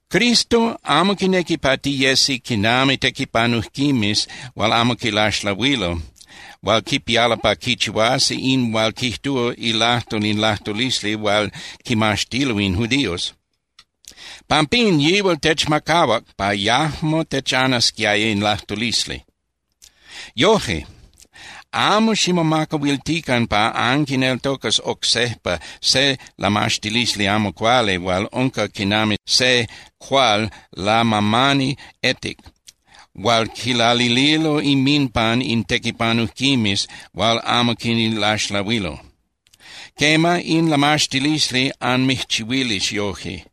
Cristo amo quinequi pa tiyesi quinami tequipanujquimes hual amo quilaxlahuilo hual quipialo pa quichihuasi in hual quijtúa ilajtol in lajtulisli hual quimaxtilo in judíos. Pampín yihual techmacahuac pa yajmo techanasquiaya in lajtulisli. Yoje, amo ximomacahuiltican pa anquineltocas oc sejpa se lamaxtilisli amo cuali hual unca quinami se cuál lamamani etic hual quilalililo inminpan in tequipanujquimes hual amo quilaxlahuilo. Quema, in lamaxtilisli anmijchihuilis yoje.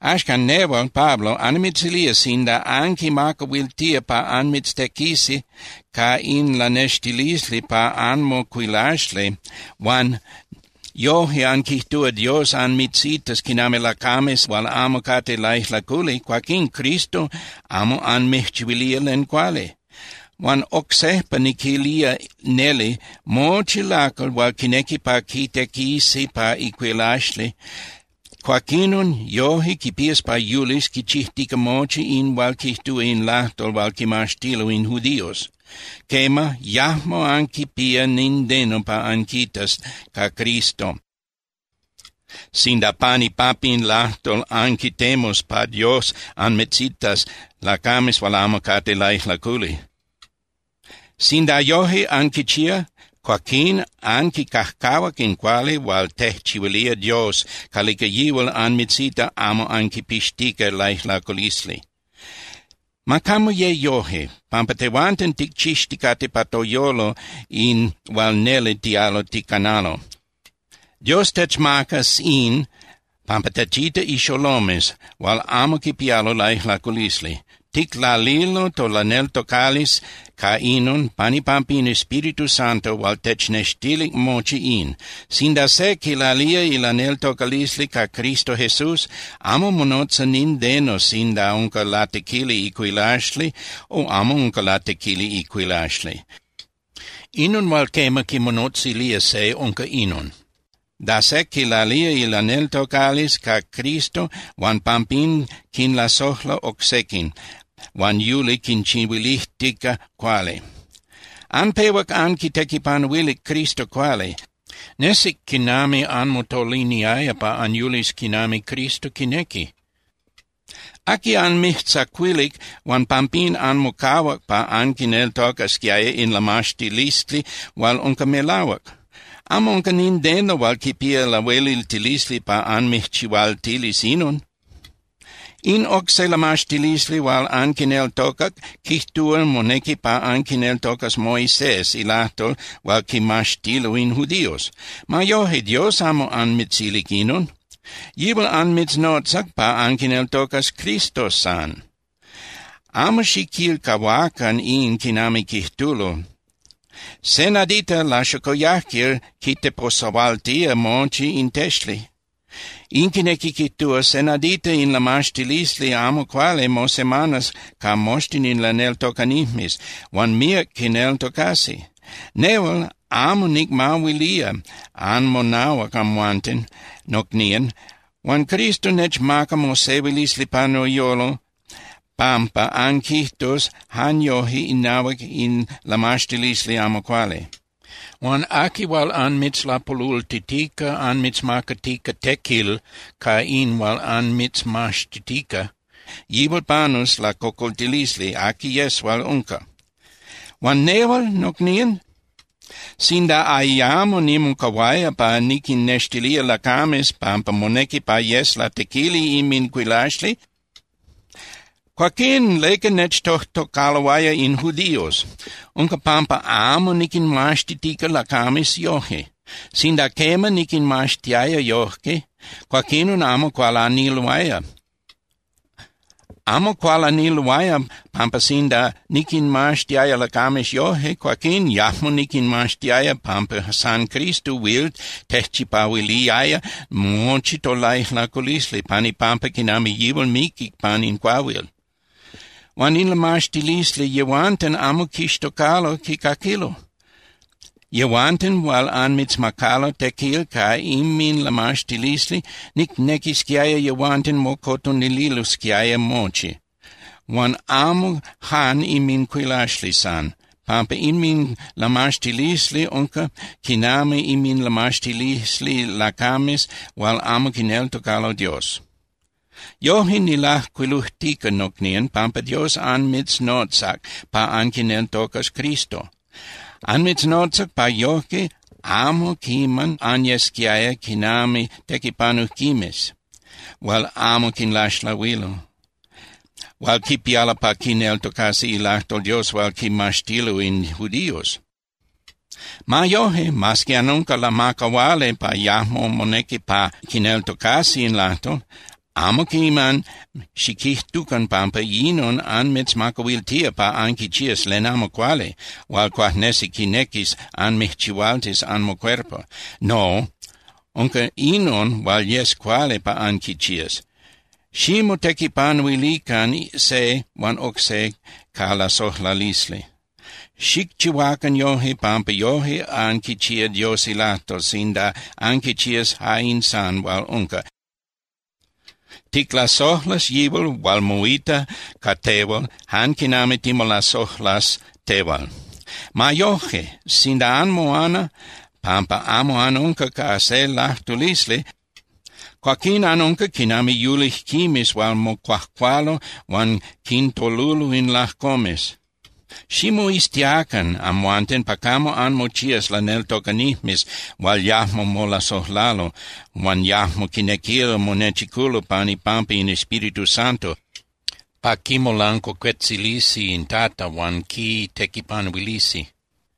Axcan, nehual, Pablo, annimitzilía sinda anquinmacahuiltía pa anmitztequisi ca in lanextilisli pa anmocuilaxli huan yoje anquijtúa Dios anmitzitas quinami lacames hual amo cate laijlaculi, cuaquín Cristo amo anmijchihuilía len cuali. Huan oc sejpa niquilía neli, mochi lacal hual quinequi pa quitequisi pa icuilaxli, cuaquinon yoje quipías pa yulis quichijtica mochi in hual quijtúa in lajtol hual quimaxtilo in judíos. Quema, yajmo anquipía nindeno pa anquitas ca Cristo sinda pan ipampa in lajtol anquitemus pa Dios anmitzitas lacames hual amo cate laijlaculi. Sinda yoje anquichía, cuaquín anquicajcahuac in cuali hual tejchihuilía Dios calica yihual anmitzita amo anquipixtica laijlaculisli. Ma camo ye yoje, pampa tehuanten ticchixticate pa toyolo in hual neli tialo ticanalo. Dios techmacas in pampa techita ixolomes hual amo quipialo laijlaculisli. Ticlalilo tolaneltocalisli ca inon pan ipampa in Espíritu Santo hual technextilic mochi in. Sinda se quilalía ilaneltocalisli ca Cristo Jesús, amo monotza nindeno sinda unca latequili icuilaxli o amo unca latequili icuilaxli. Inon hual quema quimonotzilía se unca inon, da se quilalía ilaneltocalisli ca Cristo huan pampín quinlasojla oc sequin, huan yuli quinchihuilijtica cuali. Anpehuac anquitequipanuilic Cristo cuali, nesic quinami anmotoliniaya pa anyulis quinami Cristo quinequi. ¿Aqui anmijtzacuilic huan pampín anmocahuac pa anquineltocasquiaya in lamaxtilisli hual unca melahuac? Amo unca nindeno hual quipía lahueliltilisli pa anmijchihualtilis inon. In oc se lamaxtilisli hual anquineltocac quijtúa monequi pa anquineltocas Moisés ilajtol hual quimaxtilo in judíos. Ma yoje, Dios amo anmitzilic inon. Yihual anmitznotzac pa anquineltocas Cristo san. Amo xiquilcahuacan in quinami quijtulo: “Se nadita laxocoyajquil quiteposahualtía mochi in texli.” In quinequi quijtúa se nadita in lamaxtilisli amo cuali mosemanas ca moxtin in laneltocanijmes huan míac quineltocasi. Nehual amo nicmahuilía anmonahuac amhuanten, nocnían, huan Cristo nechmaca mosehuilisli pa noyolo pampa anquijtus jan yoje inahuac in lamaxtilisli amo cuali. Huan aqui hual anmitzlapolultitica anmitzmacatica tequil ca in hual anmitzmaxtitica, yihual panus lacocoltilisli aqui yes hual unca. Huan nehual, nocnían, sinda ayamo nimocahuaya pa niquinnextilía lacames pampa monequi pa yes latequili inmincuilaxli, cuaquín ¿leca nechtojtocaloaya in judíos? Unca pampa amo niquinmaxtitica lacames yoje. Sinda quema niquinmaxtiaya yojque, cuaquinon amo cualaniloaya. Amo cualaniloaya pampa sinda niquinmaxtiaya lacames yoje, cuaquín yajmo niquinmaxtiaya pampa san Cristo huil tejchipahuiliaya mochi tolaijlaculisli pan ipampa quinami yihual miquic pan in cuahuil. Huan in lamaxtilisli yehuanten amo quixtocalo quicaquilo. Yehuanten hual anmitzmacalo tequil ca inminlamaxtilisli, nicnequisquiaya yehuanten mocotonililosquiaya mochi, huan amo jan inmincuilaxli san, pampa inminlamaxtilisli unca quinami inminlamaxtilisli lacames hual amo quineltocalo Dios. Yoje nilajcuilujtica, nocnían, pampa Dios anmitznotzac pa anquineltocas Cristo. Anmitznotzac pa yojque amo quiman anyesquiaya quinami tequipanujquimes hual amo quinlaxlahuilo, hual quipialo pa quineltocasi ilajtol Dios hual quimaxtilo in judíos. Ma yoje, mas que anunca lamacahuali pa yajmo monequi pa quineltocasi in lajtol, amo quiman xiquijtucan pampa inon anmitzmacahuiltía pa anquichías len amo cuali hual cuajnesi quinequis anmijchihualtis anmocuerpo. No, unca inon hual yes cuali pa anquichías: Ximotequipanuilican se huan oc se ca lasojlalisli. Xicchihuacan yojque pampa yoje anquichías Dios ilajtol sinda anquichías ja in san hual unca: “Ticlasojlas yihual hual moita ca tehual jan quinami timolasojlas tehual.” Ma yoje, sinda anmoana pampa amo anunca ca se lajtulisli, cuaquín anunca quinami yulijquimes hual mocuajcualo huan quintolulo in lajcomes. Ximoiztiacan amhuanten pa camo anmochías laneltocanijmes hual yajmo molasojlalo huan yajmo quinequilo monechiculo pan ipampa in Espíritu Santo pa quimolancuacuetzilisi in Tata huan quitequipanuilisi.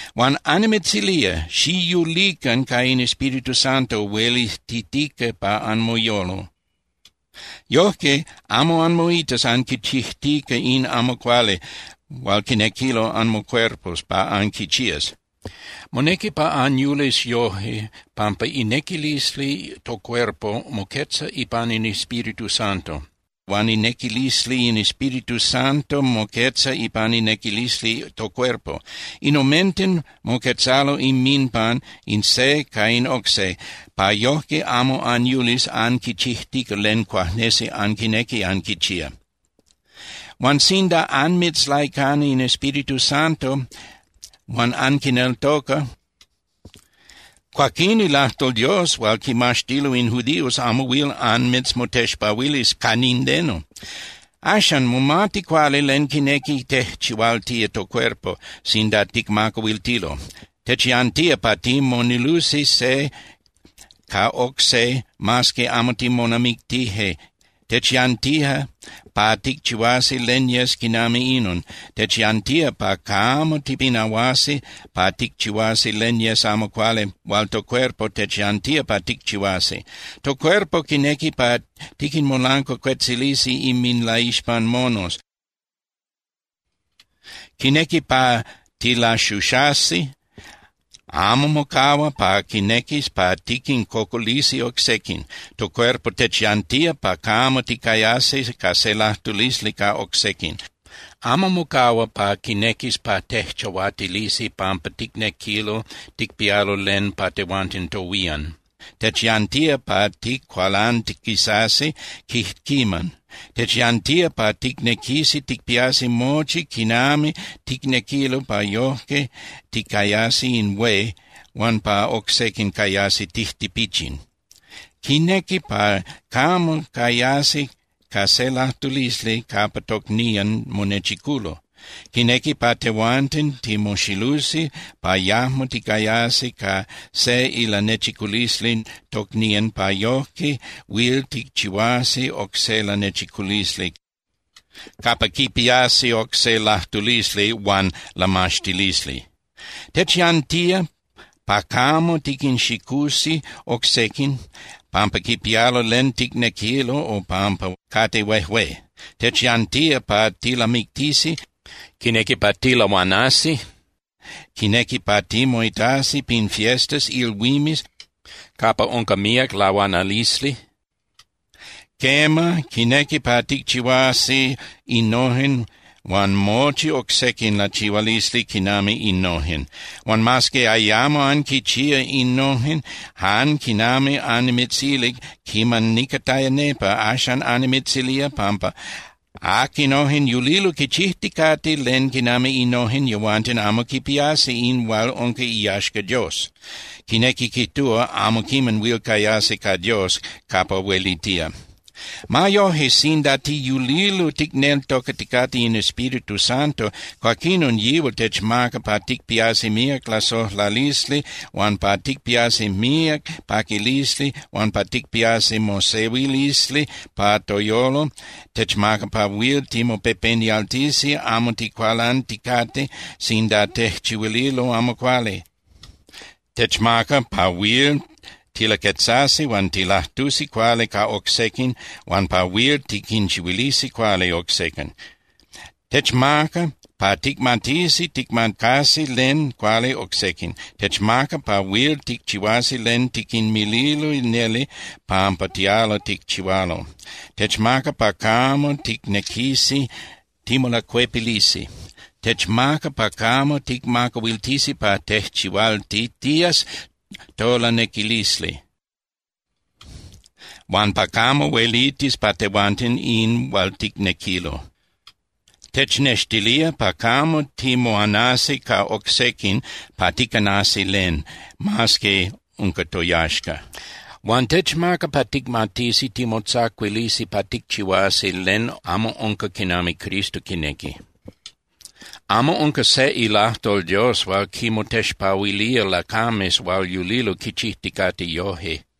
Huan annimitzilía, xiyulican ca in Espíritu Santo huelitijtica pa anmoyolo. Yojque amo anmoitas anquichijtica in amo cuali hual quinequilo anmocuerpos pa anquichías. Monequi pa anyulis yojque pampa inequilisli tocuerpo moquetza ipan in Espíritu Santo, huan inequilisli in Espíritu Santo moquetza ipan inequilisli tocuerpo. In omenten moquetzalo inminpan in se ca in oc se, pa yojque amo anyulis anquichijtica len cuajnesi anquinequi anquichía. Huan sinda anmitzlaicana in Espíritu Santo huan anquineltoca, cuaquín ilajtol Dios hual quimaxtilo in judíos amo huil anmitzmotexpahuilis ca nindeno. Axan, momati cuali len quinequi tejchihualtía tocuerpo sinda ticmacahuiltilo. Techyantía pa timonilusi se ca oc se mas que amo timonamictije, techyantía pa ticchihuasi len yes quinami inon, techyantía pa camo tipinahuasi pa ticchihuasi len yes amo cuali hual tocuerpo techyantía pa ticchihuasi. Tocuerpo quinequi pa tiquinmolancuacuetzilisi inminlaixpan monos, quinequi pa tilaxuxasi, amo mocahua pa quinequis pa tiquincocolisi oc sequin. Tocuerpo techyantía pa camo ticayasi ca se lajtulisli ca oc sequin. Amo mocahua pa quinequis pa tejchahuatilisi pampa ticnequilo ticpialo len pa tehuanten tohuían. Techyantía pa ticualantiquisasi quijquiman. Techyantía pa ticnequisi ticpiasi mochi quinami ticnequilo pa yoje ticayasi in hué huan pa oc sequin cayasi tijtipichin. Quinequi pa camo cayasi ca se lajtulisli capa tocnían monechiculo. Quinequi pa tehuanten timoxilusi pa yajmo ticayasi ca se ilanechiculisli tocnían pa yojque huil ticchihuasi oc se lanechiculisli capa quipiasi oc se lajtulisli huan lamaxtilisli. Techyantía pa camo tiquinxicusi oc sequin pampa quipialo len ticnequilo o pampa cate huejué. Techyantía pa tilamictisi, quinequi pa tilahuanasi, quinequi pa timoitasi pin fiestas (ilhuimes) capa unca míac lahuanalisli. Quema, quinequi pa ticchihuasi innojen huan mochi oc sequin lachihualisli quinami innojen. Huan mas que ayamo anquichía innojen, jan quinami annimitzilic quiman nicataya nepa, axan annimitzilía pampa aquinojen yulilo quichijticate len quinami innojen, yehuanten amo quipiasi in hual unca iyaxca Dios. Quinequi quijtúa, amo quiman huil cayasi ca Dios capa huelitía. Ma yoje, sinda tiyulilo ticneltocaticate in Espíritu Santo, cuaquinon yihual techmaca pa ticpiasi míac lasojlalisli huan pa ticpiasi míac paquilisli huan pa ticpiasi mosehuilisli pa toyolo. Techmaca pa huil timopepenialtisi amo ticualanticate sinda tejchihuililo amo cuali, techmaca pa huil tilaquetzasi huan tilajtusi cuali ca oc sequin huan pa huil tiquinchihuilisi cuali oc sequin, techmaca pa ticmatisi ticmacasi len cuali oc sequin, techmaca pa huil ticchihuasi len tiquinmililo neli pampa tialo ticchihualo. Techmaca pa camo ticnequisi timolacuepilisi. Techmaca pa camo ticmacahuiltisi pa tejchihualtitías tolanequilisli, huan pa camo huelitis pa tehuanten in hual ticnequilo. Technextilía pa camo timoanasi ca oc sequin pa ticanasi len, mas que unca toyaxca. Huan techmaca pa ticmatisi timotzacuilisi pa ticchihuasi len amo unca quinami Cristo quinequi. Amo unca se ilajtol Dios hual quinmotexpahuilía lacames hual yulilo quichijticate yoje.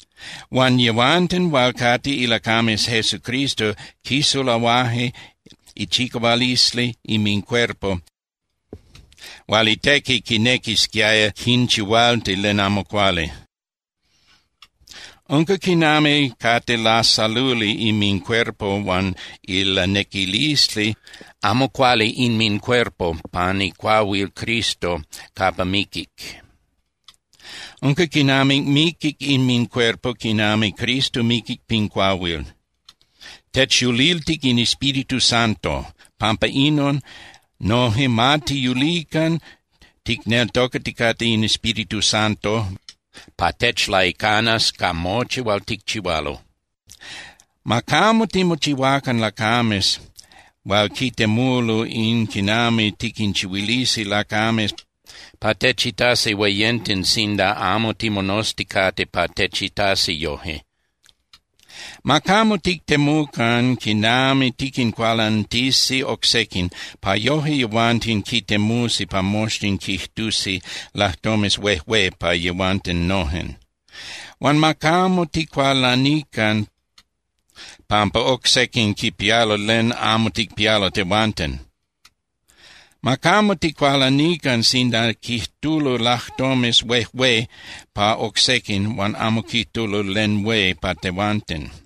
Huan yehuanten hual cate ilacames Jesucristo quisulahuaje ichicahualisli inmincuerpo hual itequi quinequisquiaya quinchihualti len amo cuali. Unca quinami cate lasaluli inmincuerpo huan ilanequilisli amo cuali inmincuerpo pan icuahuil Cristo capa miquic. Unca quinami miquic inmincuerpo, quinami Cristo miquic pin cuahuil. Techyuliltic in Espíritu Santo. Pampa inon, noje ma tiyulican ticneltocaticate in Espíritu Santo pa techlaicanas ca mochi hual ticchihualo. Ma camo timochihuacan lacames hual quitemulo in quinami tiquinchihuilisi lacames pa techitasi hueyenten sinda amo timonozticate pa techitasi yoje. Ma camo tictemucan quinami tiquincualantisi oc sequin pa yoje yehuanten quitemusi pa moxtin quijtusi lajtomes huejué pa yehuanten nojen. Huan ma camo ticualanican pampa oc sequin quipialo len amo ticpialo tehuanten. Ma camo ticualanican sinda quijtulo lajtomes huejué pa oc sequin huan amo quijtulo len hué pa tehuanten.